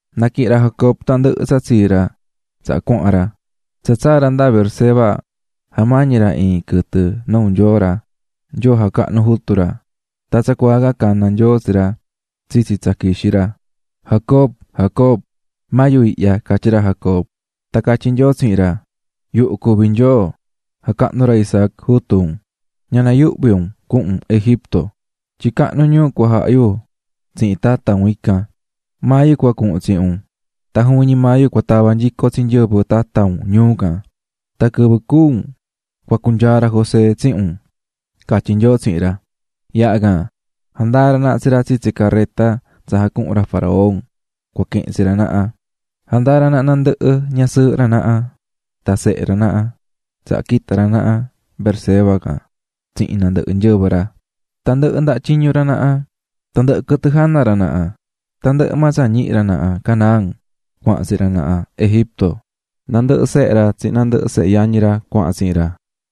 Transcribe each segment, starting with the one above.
Naquihi̱n ra Jacob tandɨhɨ tsa tsii ra tsaha cuahan ra. Tsa tsaa̱ ra nda Beerseba jamañi̱ ra iin quɨtɨ nuu Nyoo ra, Nyoo jacahnu̱ jutu ra. Tan tsacuaa can cana̱ Nyoo tsi ra tsitsi tsa quixí ra: --Jacob, Jacob. --Maa yu ihya --catyí ra Jacob. Tan catyí Nyoo tsihin ra: --Yuhu cuví Nyoo jacahnu̱ ra Isaac, jutu un. Ña nayuhvi un cuhun un Egipto, tyin cahnu ñuu cua jaha yu tsihin tata un ndacan. Maa yu cua cuhun tsihin un, tan juvin ñi maa yu cua tava nyico tsi nyɨvɨ tata un ñuu can, tan quɨvɨ cúu un cua cunyaa ra José tsihin un --catyí Nyoo tsihin ra. Yaha can, jandaa̱ ra naha tsi ra tsitsi careta tsa jacuhu̱n ra faraón cua quihin tsi ra naha, jandaa̱ ra naha nandɨhɨ ñasɨɨhɨ ra naha tan sehe ra naha, tsaha quita̱ ra naha Beerseba can tsihin nandɨhɨ nyɨvɨ ra, tandɨhɨ ndaha tyiñu ra naha, tandɨhɨ quɨtɨ jana ra naha. Tandɨhɨ maa tsa ñihi̱ ra naha Canaán cuahan tsihin ra naha Egipto. Nandɨhɨ sehe ra tsihin nandɨhɨ sehe yañi ra cuahan tsihin ra.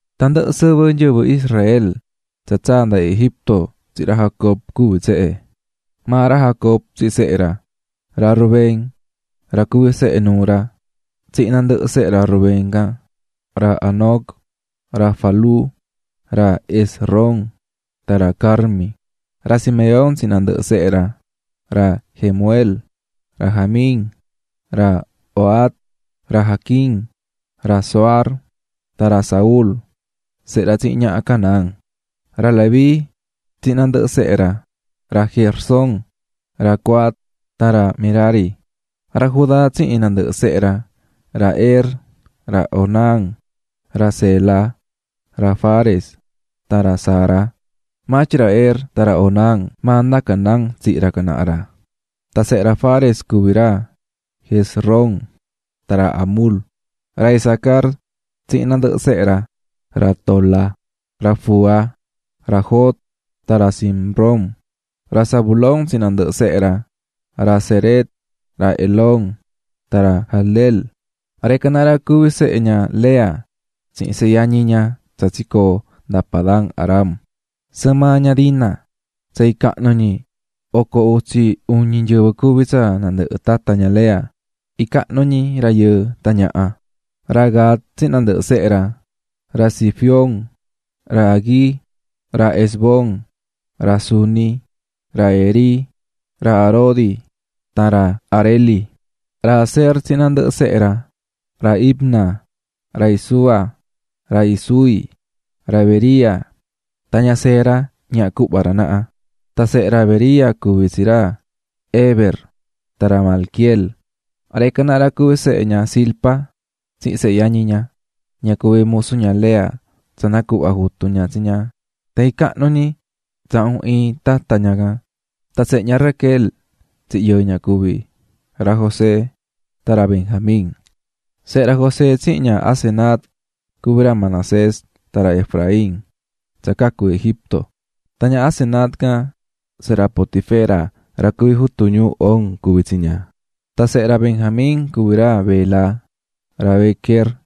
Tandɨhɨ sɨvɨ nyɨvɨ Israel tsa tsaa̱ nda Egipto tsihin ra Jacob cuví tsehe: Ra Rubén, ra cuví sehe nuu ra, tsihin nandɨhɨ sehe ra Rubén can: ra Hanoc, ra Falú, ra Hezrón tan ra Carmi. Ra Simeón tsihin nandɨhɨ sehe ra: ra Jemuel, ra Jamín, ra Ohad, ra Jaquín, ra Zohar tan ra Saúl sehe ra tsihin ñaha Canaán. Ra Leví tsihin nandɨhɨ sehe ra: ra Gersón, ra Coat tan ra Merari. Ra Judá tsihin nandɨhɨ sehe ra: ra Er, ra Onán, ra Sela, ra Fares tan ra Zara, (maa tyin ra Er tan ra Onán maa nda Canaán tsihi̱ ra can naha ra.) Tan sehe ra Fares cuví ra Hezrón tan ra Hamul. Ra Isacar tsihin nandɨhɨ sehe ra: ra Tola, ra Fúa, ra Job tan ra Simrón. Ra Zabulón tsihin nandɨhɨ sehe ra: ra Sered, ra Elón tan ra Jahleel. Ra ican naha ra cuví sehe ña Lea tsihin sehe yañi ña tsa tsicoo̱ nda Padan-aram, sɨɨn maa ña Dina. Tsa icahnu ñi oco utsi uñi nyɨvɨ cuví tsa nandɨhɨ tata ña Lea, icahnu ñi rayɨɨ tan ñaha. Ra Gad tsihin nandɨhɨ sehe ra: ra Zifión, ra Hagui, ra Ezbón, ra Suni, ra Eri, ra Arodi, tan ra Areli. Ra Aser tsihin nandɨhɨ sehe ra: ra Imna, ra Isúa, ra Isúi, ra Bería, tan ña Sera ñaha cuhva ra naha. Tan sehe ra Bería cuví tsi ra Heber tan ra Malquiel. Ra ican naha ra cuví sehe ña Zilpa tsihin sehe yañi ña, ña cuví musu ña Lea tsa nacuhva̱ jutu ña tsi ña. Tsa icahnu ñi tsahun iin tata ña can. Tan sehe ña Raquel tsihin yɨɨ ña cuví: ra José tan ra Benjamín. Sehe ra José tsihin ña Asenat cuví ra Manasés tan ra Efraín tsa cacu̱ Egipto, tan ña Asenat can, sehe ra Potifera ra cuví jutu ñuu On cuví tsi ña. Tan sehe ra Benjamín cuví ra Bela, ra Bequer,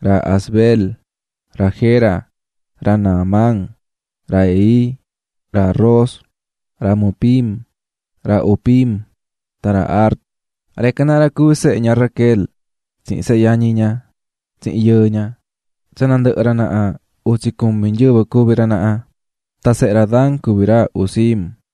ra Asbel, ra Gera, ra Naamán, ra Ehi, ra Ros, ra Mupim, ra Hupim tan ra Ard. Ra ican naha ra cuví sehe ña Raquel tsihin sehe yañi ña tsihin yɨɨ ña, tsa nandɨhɨ ra naha, utsi cumi nyɨvɨ cuví ra naha. Tan sehe ra Dan cuví ra Husim.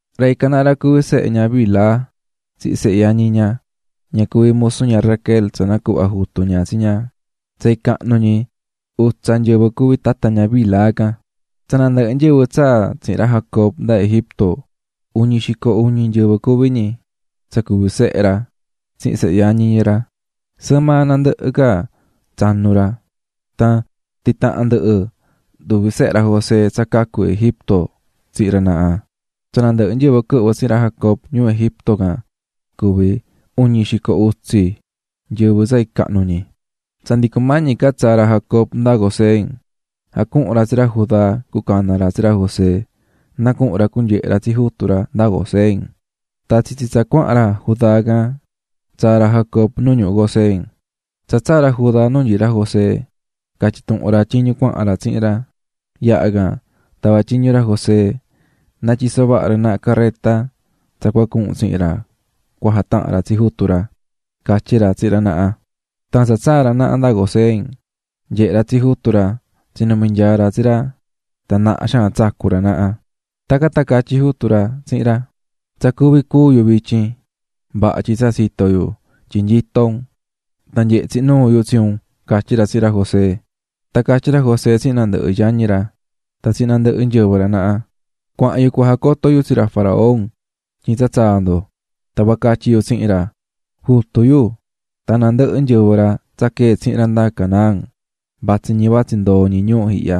Ra ican naha ra cuví sehe ña Bilha tsihin sehe yañi ña, ña cuví musu ña Raquel tsa nacuhva̱ jutu ña tsi ña, tsa icahnu ñi utsa nyɨvɨ cuví tata ña Bilha can. Tsa nandɨhɨ nyɨvɨ tsaa̱ tsihin ra Jacob nda Egipto, uñi xico iñu nyɨvɨ cuví ñi, tsa cuví sehe ra tsihin sehe yañi ra, sɨɨn maa nandɨhɨ ca tsanu ra. Tan titaha̱n ndɨhɨ nduvi sehe ra José tsa cacu̱ Egipto tsihin ra naha, tsa nandɨhɨ nyɨvɨ quɨhvɨ̱ tsihin ra Jacob ñuu Egipto can cuví uñi xico utsi nyɨvɨ tsa icahnu ñi. Tsa ndi cumañi ca tsaa ra Jacob nda Gosén, jacuhu̱n ra tsi ra Judá cuacana ra tsi ra José na cuhun ra cunyehe ra tsi jutu ra nda Gosén. Tan tsitsi tsa cuahan ra Judá can, tsaa̱ ra Jacob nu ñuhu Gosén. Tsa tsaa̱ ra Judá nu nyií ra José, catyi̱ tuhun ra tyiñu cuahan ra tsihin ra. Yaha can tava̱ tyiñu ra José na tyiso vaha ra naha careta ra tyin cua cuhun ra cujatahan ra tsi jutu ra, catyí ra tsihin ra naha. Tan tsa tsaa̱ ra naha nda Gosén nyehe̱ ra tsi jutu ra, tsinumi̱ nyaa ra tsi ra tan naha xaan tsacu̱ ra naha. Tacan tan catyí jutu ra tsihin ra: --Tsa cuví cúu yu vityin, vaha tyin tsa tsito̱ yu tyin nyito un tan nyehe̱ tsihin nuu yu tsi un --catyí ra tsihin ra José. Tan catyí ra José tsihin nandɨhɨ yañi ra tan tsihin nandɨhɨ nyɨvɨ ra naha: --Cuahan yu cua jacoto yu tsi ra faraón tyin tsa tsaa̱ ndo, tan cua catyi yu tsihin ra: ꞌJutu yu tan nandɨhɨ nyɨvɨ quee̱ tsihin ra nda Canaán vatsí ñi vatsí ndoo ñi ñuu ihya.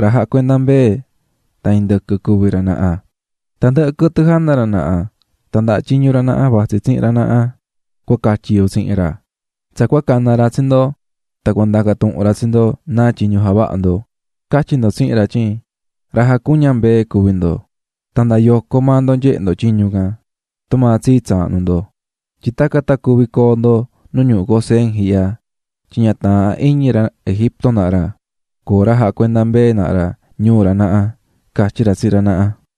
Ra jacuendá mbee tan indɨquɨ cuví ra naha, tandɨhɨ quɨtɨ jana ra naha tan ndaha tyiñu ra naha vatsí tsihin ra nahaꞌ, cua catyi yu tsihin ra. Tsa cua cana ra tsi ndo tan cua ndacan tuhun ra tsi ndo náa tyiñu javahá ndo, ca̱tyi ndo tsihin ra tyin ra jacuñá mbee cuví ndo, nda yoco maa ndo tan nyehé ndo tyiñu ihya, tumaa tsii tsaahnu yo. Tyin tacan tan cuvi coo ndo nu ñuhu Gosén ihya, tyin ña taahán iñi ra Egipto naha ra coo ra jacuendá mbee naha ra ñuu ra naha --catyí ra tsihin ra naha.